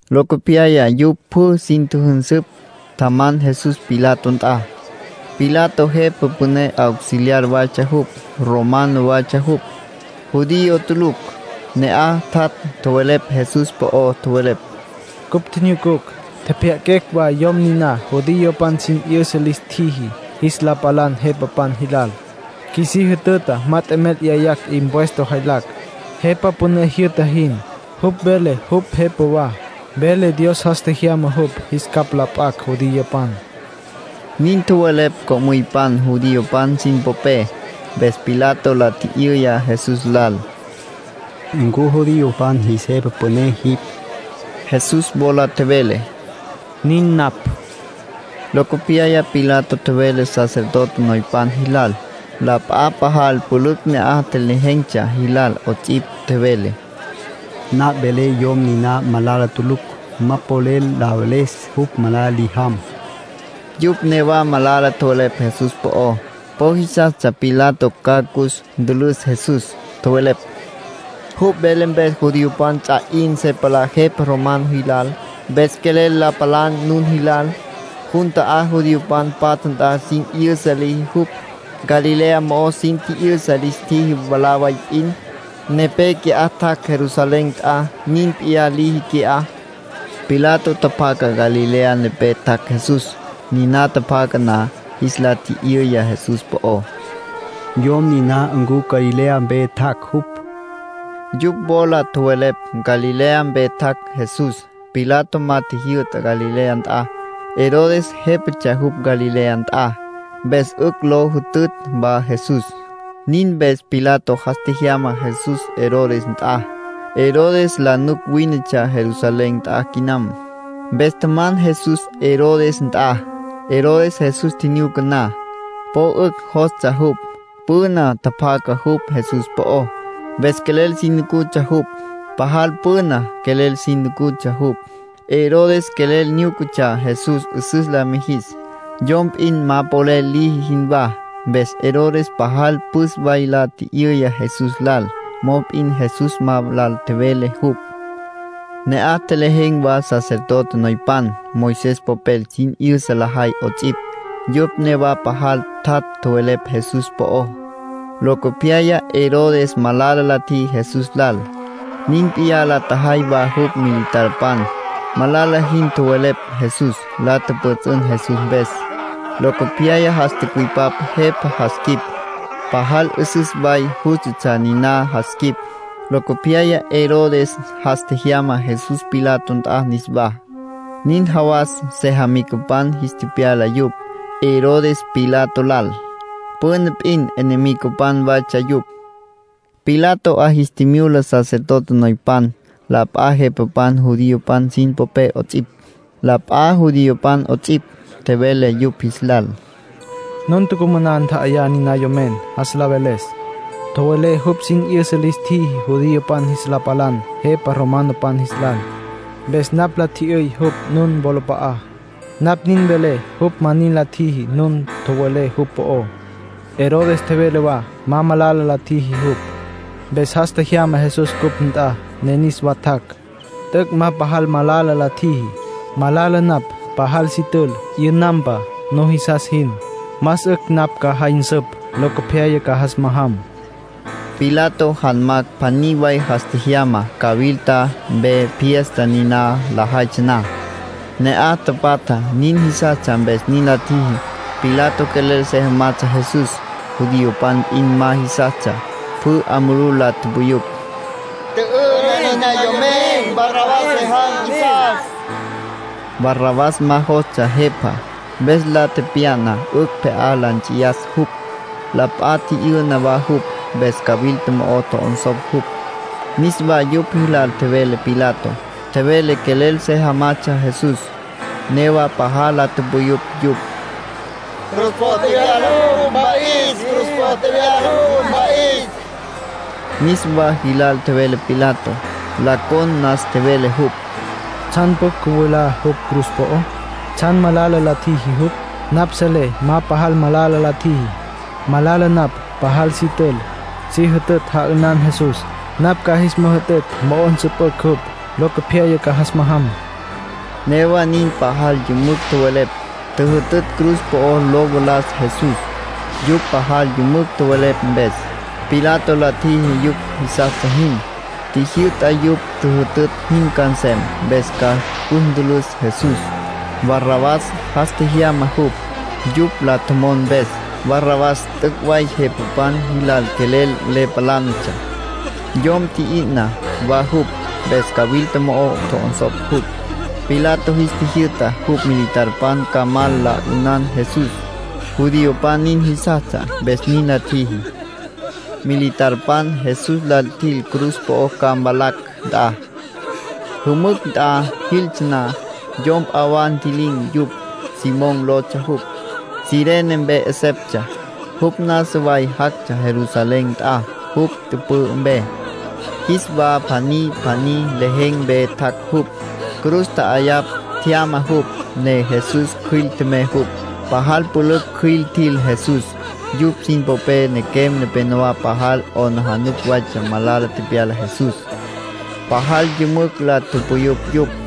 Locopyaya yupj pjü sin tjüjünsüpj, tjaman Jesús Pilato nt'a. Pilato jepa püné auxiliar waytsja jupj. Romano waytsja jupj, judío tulucj. Ne'aj tjat' tjowelepj Jesús po'ó. Tjowelepj: —Cupj tjinyucucj, tjepjya'aquecj wa yom niná judiopan sin 'yüsa lis tjiji jis la palan jepapan jilal. Qjuisí jütüta ma t'emel 'yayacj impuesto jaylacj, jepa püné jyü'ta jin. Jupj vele jupj jepa wa. Vele Dios jas tjejyama jupj jis capj la p'acj judiopan —nin tjowelepj co'müypan judiopan sin popé. Mpes Pilato la tji'yüya Jesús lal: —¿Ncu judiopan jis jepa püné jipj? Jesús wola tjevele: —Nin napj. Locopyaya Pilato tjevele sacerdote noypan jilal, la p'a pajal pülücj ne'aj tjelejen̈tsja jilal 'ots'ipj. Tjevele: —Napj velé yom niná malala tulucj. Ma polel la veles jupj malala li jam. Yupj newa malala tjowelepj Jesús po'ó. Po jisastsja Pilato ca cus ntülüs Jesús. Tjowelepj: —Jupj vele mpes judiopan ts'a 'in se palá jepa romanopan jilal, mpes quelel la palan nun jilal. Jun ta'á judiopan patja nt'a sin 'yüsa liji jupj. Galilea mo'ó sin tji'yüsa lis tjiji mwalá way p'in. Nepé qui'á tjac' Jerusalén nt'a. Nin p'iyá liji qui'á —tjowelepj yupj. Pilato tjapjaca Galilea nepé tjac' Jesús. Niná tjapjaca na, jis la tji'yüya Jesús po'ó: —Yom niná ¿ncu Galilea mpe tjac' jupj? Yupj wola tjowelepj Galilea mpe tjac' Jesús. Pilato ma tjijyü'ta Galilea nt'a. Herodes jépatsja jupj Galilea nt'a, mpes 'ücj lo jütütj wa Jesús. Nin mpes Pilato jas tjejyama Jesús Herodes nt'a. Herodes la nuc wínetsja Jerusalén nt'a quinam. Mpes tjaman Jesús Herodes nt'a. Herodes Jesús tjinyuca na, po 'ücj jostsja jupj. Püna tjapjaca jupj Jesús po'ó, mpes quelel si nucutsja jupj. Pajal püna quelel si nucutsja jupj. Herodes quelel nyúcatsja Jesús 'üsüs la mijis, yom p'in ma polel liji jinwá. Mpes Herodes pajal püs way la tji'yüya Jesús lal. Mop'in Jesús ma lal tjevele jupj. Ne'aj tjelejen̈ wa sacerdote noypan, Moisés popel sin 'yüsa lajay 'ots'ipj. Yupj newa pajal tjat' tjowelepj Jesús po'ó. Locopyaya Herodes malala la tjiji Jesús lal. Nin p'iyá la tjajay wa jupj militarpan. Malala jin tjowelepj Jesús. La tjüpjüts'ün Jesús mpes. Locopyaya jas tücüipap jepa jas quip. Pajal 'üsüs way jústatsja niná jas quip. Locopyaya Herodes jas tjejyama Jesús Pilato nt'a niswá. Nin jawas sejamicapan jis tepyala yupj, Herodes Pilato lal. Püna p'in enemigopan waytsja yupj. Pilato 'a jis tjimyula sacerdote noypan, la p'a jepapan judiopan sin popé 'ots'ipj, la p'a judiopan 'ots'ipj. Tjevele yupj jis lal: —Nun tucumaná ntja'ayá niná yomen, jas la veles. Tjowelé jupj sin 'yüsa lis tjiji judiopan jis la palan jepa romanopan jis lal. Mpes napj la tji'yüy jupj nun nuwolap'a'á. Napj nin velé jupj ma nin la tjiji nun tjowelé jupj po'ó. Herodes tjevele wa ma malala la tjiji jupj, mpes jas tjejyama Jesús cupj nt'a, ne niswa tjac'. T'üc' ma pajal malala la tjiji. Malala napj pajal si tül, 'yünampa, nujisas jin. Más 'ücj napj ca jay nsüp, locopyaya ca jas majam. Pilato janmacj pjaní way jas tjejyama cawilta mpe fiesta niná lajaytsja na. Ne'aj tapatja nin jisastsja mpes nin la tjiji. Pilato quelel se jamatsja Jesús. Judiopan p'in ma jisastsja. Pjü 'a mulú la tupuyupj: —¡Tjü'ü'ná niná yomen! Barrabás se jam qjuisas. (Barrabás ma jostsja jepá, mpes la tepya'na 'ücj pje'á la nts'iyas jupj. La p'a tji'yü'na wa jupj, mpes cawilta mo'o tjo'onsopj jupj.) Niswa yupj jilal tjevele Pilato. Tjevele quelel se jamatsja Jesús. Newa pajal la tupuyupj yupj: —Cruz po'o tjevyala jupj, mpa'is. Cruz po'o tjevyala jupj, mpa'is. Niswa jilal tjevele Pilato. La con nas tjevele jupj: —¿Tsjan pjucj cüvalá jupj cruz po'ó? ¿Tsjan malala la tjiji jupj? Napj selé ma pajal malala la tjiji. Malala napj pajal si tül, si jütütj ja'ünan Jesús. Napj ca jis müjütütj mo'o nsüpücj jupj; locopyaya ca jas majam —tjevele Pilato. Newa nin pajal yümücj tjowelepj, tjüjütütj cruz po'ó lo valas Jesús. Yupj pajal yümücj tjowelepj mpes, Pilato la tjiji yupj jisastsja jin. Tjijyü'ta yupj tjüjütütj jin ca nsem, mpes ca cus ntülüs Jesús. Barrabás jas tjejyama jupj, yupj la tjomon mpes. Barrabás t'üc' way jepapan jilal quelel le palánatsja, yom tji'yü'na wa jupj, mpes cawilta mo'o tjo'onsopj jupj. Pilato jis tjijyü'ta jupj militarpan ca mal la 'ünan Jesús. Judiopan nin jisastsja, mpes nin la tjiji. Militarpan Jesús lal tjil cruz po'ó ca mvalacj nt'a. Jümücj nt'a jiltsja na, yom p'a wa ntji'lin̈ yupj. Simón lotsja jupj, Cirene mpe 'eseptsja. Jupj nasa way jactsja Jerusalén nt'a jupj tüpü'ü mpe. Jis wa pjaní pjaní lejen̈ mpe tjac' jupj. Cruz tja'ayapj tjyama jupj, ne Jesús cjüil tjemey jupj. Pajal pülücj cjüil tjil Jesús. Yupj sin popé nequem nepénowa pajal 'aplijila waytsja malala tepyala Jesús. Pajal yümücj la tupuyupj yupj.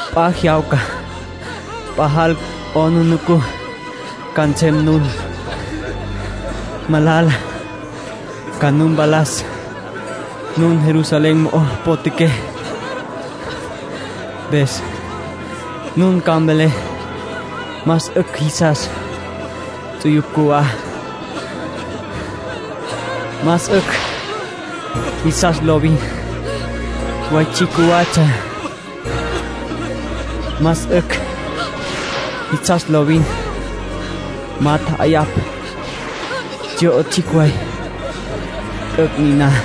P'a jyawca pajal 'aplijila ca nsem nun. Malala ca nu mpalas nun Jerusalén mo'o potjaqué. Mpes nun ca mvelé: ‘Más 'ücj jisas ts'uyupj cjuwá. Más 'ücj jisas lovin way tsjicj cjuwatsja. Más 'ücj jisas lovin ma tja'ayapj tsyo'o tsjicj way.’ T'üc' niná.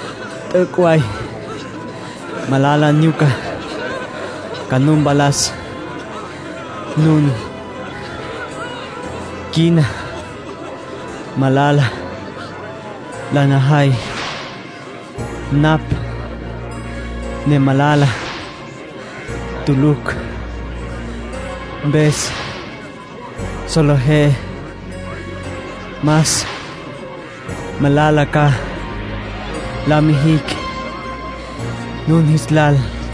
T'üc' way malala nyuca ca nu mpalas nun. Quina malala la najay, napj ne malala tulucj. Mpes solejé más malala ca la mijicj nun jis lal —tjevele Jesús.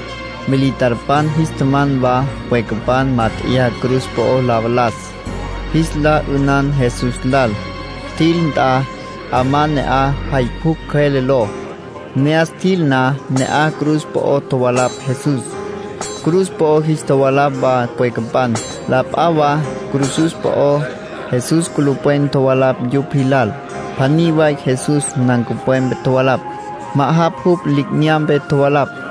Militarpan jis tjaman wa pwecapan mát'eya cruz po'o la valas, jis la 'ünan Jesús lal. Tjil nt'a 'amá ne'aj Jay Pjucj Cjüele ló. Ne'as tjil na, ne'aj cruz po'o tjovalapj Jesús. Cruz po'o jis tjovalapj wa pwecapan, la p'a wa cruzus po'ó. Jesús culupwen tjovalapj yupj jilal. Pjaní way Jesús nancupwepe tjovalapj. Ma'ajapj jupj li'inyampe tjovalapj.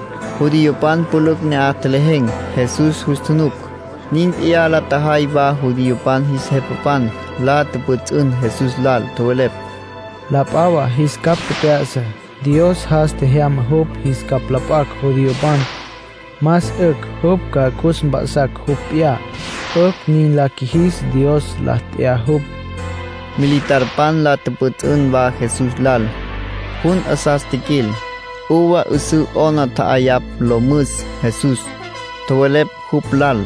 Judiopan pülücj ne'aj tjelejen̈, Jesús jus tjunuc. Nin p'iyá la tjajay wa judiopan jis jepapan. La tjüpjüts'ün Jesús lal. Tjowelepj: —La p'a wa jis capj tjep'ya'sa. Dios jas tjejyama jupj jis capj la p'acj judiopan, más 'ücj jupj ca cus mp'a'sas jupj p'iyá. 'Ücj nin la qjuijis, Dios la t'ya jupj. Militarpan la tjüpjüts'ün wa Jesús lal. Jun 'asas tjiquil, uva 'üsǘ 'ona tja'ayapj lo müs Jesús. Tjowelepj jupj lal: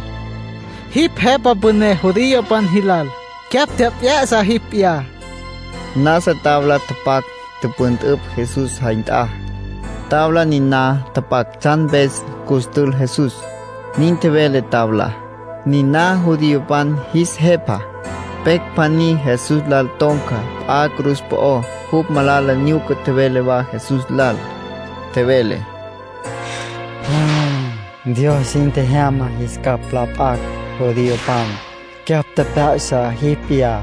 —Jipj jepa püné judiopan jilal, cyapj tjep'ya'sa jipj p'iyá. Nasa tabla tapac, tüpüntüpj Jesús jay nt'a. Tabla niná tapac tsjan mpes cus tül Jesús. Nin tjevele tablá: NINÁ JUDIOPAN JIS JEPA. Pecj pjaní Jesús lal ton̈ca p'a cruz po'ó, jupj malala nyuca tjevele wa Jesús lal. Tjevele: —Dios jin tjejyama jis capj la p'acj judiopan, cyapj tjep'ya'sa jipj p'iyá,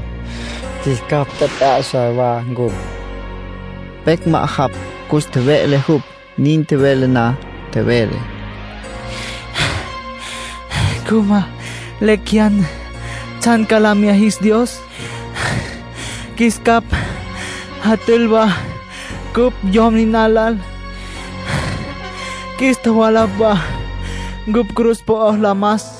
qjuis capj tjep'ya'sa wa ncupj. Pecj ma'ajapj cus tjeve'le jupj, nin tjevele na. Tjevele: —¿Ncu ma lecj jeyan tsjan ca la mya jis Dios? Qjuis capj jatül wa ncupj yom niná lal. Qjuis tjovalapj wa ncupj cruz po'ó la mas.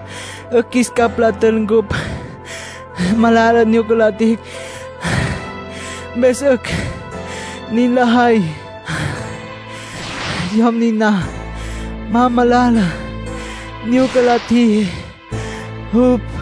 'Ücj qjuis capj jatül ncupj. Malala nyuca la tjijicj, mpes 'ücj nin lajay. Yom niná ma malala nyuca la tjiji jupj.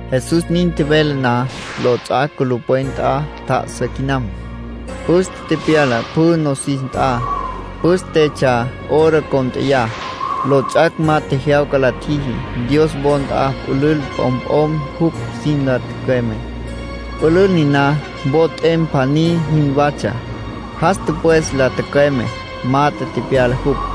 Jesús nin tjevele na, lots'ac' culupwen nt'a tjá'asa quinam. Püste tepyala pjü nosis nt'a. Pǘstetsja hora cónt'eya. Lots'ac' ma tjejyawca la tjiji. Dios wo nt'a pülül p'omp'om jupj sin la tücüeme. Pülül niná wo t'em pjaní jinwatsja. Jas tüpwes la tücüeme, mat'e tepyala jupj.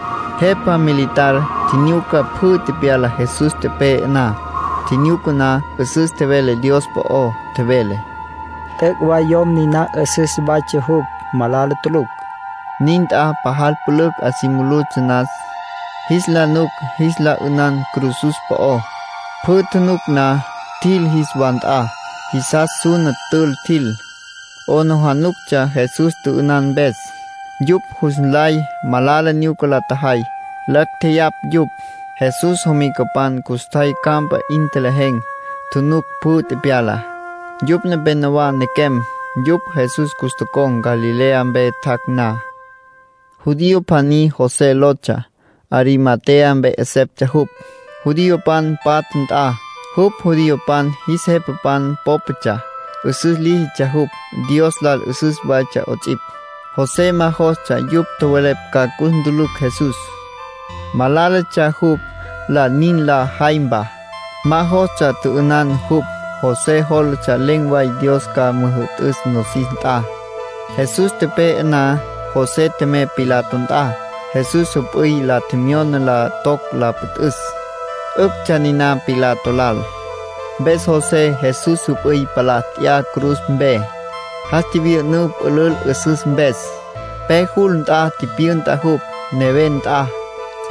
Jepa militar tjinyuca pjü tepyalá Jesús tepe'e na. Tjinyuca na, 'üsüs tjevele Dios po'ó. Tjevele: —T'üc' way yom niná 'üsüs waytsja jupj, malala tulucj. Nin nt'a pajal pülücj 'a si mulutsja nas, jis la nuc jis la 'ünan cruzus po'ó. Pjü tjunuc na, tjil jis wa nt'a. Jisas suna tül tjil. 'Aplijílatsja Jesús tjü'ünan mpes. Yupj jus nlay malala nyuca la tjajay. Lacj tjeyapj yupj. Jesús jomicapan custjay campa 'in tjelejen̈, tjunuc pjü tepyalá. Yupj nepénowa nequem. Yupj Jesús cus tocon̈, Galilea mpe tjac' na. Judío pjaní José lotsja. Arimatea mpe 'eseptsja jupj, judiopan patja nt'a. Jupj judiopan jis jepapan pópatsja. 'Üsüs líjitsja jupj. Dios lal 'üsüs waytsja 'ots'ipj. José ma jostsja yupj tjowelepj ca cus ntülücj Jesús. Malálatsja jupj lal nin la jaympa. Ma jostsja tjü'ünan jupj. José jólatsja len̈ way Dios ca müjü'tüs nosis nt'a. Jesús tepe'e na, José tjemey Pilato nt'a. Jesús jüp'üy la tjemyona la toc la püntüs. 'Üctsja niná Pilato lal. Mpes José Jesús jüp'üy palá nt'ya cruz mpe. Jas tjivyü'ünǘ pülül 'üsüs mpes. Pe jul nt'a tipyünta jupj, neven nt'a,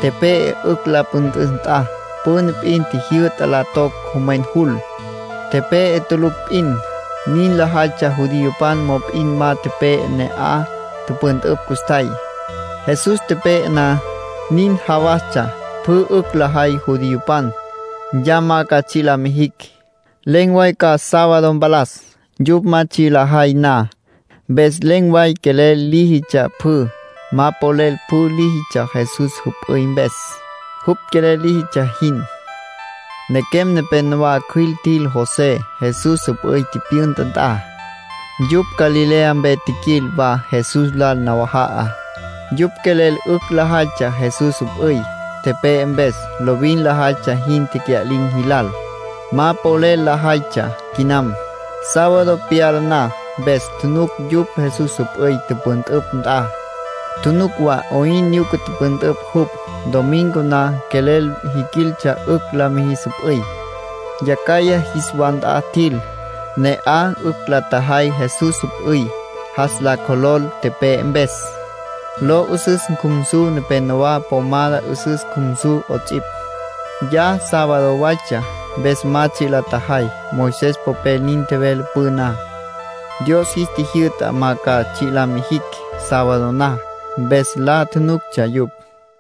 tepe'e 'ücj la püntüs nt'a. Püna p'in tjijyü'ta la toc jomwen jul, tepe'e tulucj p'in. Nin lajaytsja judiopan. Mop'in ma tepe'e ne'aj tüpüntüpj custjay. Jesús tepe'e na, nin jawastsja pjü 'ücj lajay judiopan, ya ma ca tsji' la mijicj. Len̈ way ca sábado mpalas, yupj ma tsji' lajay na. Mpes len̈ way quelel líjitsja pjü. Ma polel pjü líjitsja Jesús jüp'üy mpes, jupj quelel líjitsja jin. Nequem nepénowa cjüil tjil José, Jesús jüp'üy tipyünta nt'a. Yupj Galilea mpe tjiquil wa Jesús lal nawaja'a. Yupj quelel 'ücj lajaytsja Jesús jüp'üy, tepe'e mpes, lovin lajaytsja jin tecya'lin̈ jilal. Ma polel lajaytsja quinam, sábado pyala na. Mpes tjunuc yupj Jesús jüp'üy tüpüntüpj nt'a, tjunuc wa 'oyn nyuca tüpüntüpj jupj. Domingo na quelel jiquiltsja 'ücj la mijis jüp'üy. Yacjaya jis wa nt'a tjil. Ne'aj 'ücj la tjajay Jesús jüp'üy jas la cjolol tepe'e mpes, lo 'üsüs cjumsu nepénowa, pomada 'üsüs cjumsu 'ots'ipj. Ya sábado waytsja, mpes ma tsji' la tjajay. Moisés popel nin tjevele püná. Dios jis tjijyü'ta ma ca tsji' la mijicj sábado na, mpes la nuctsja yupj.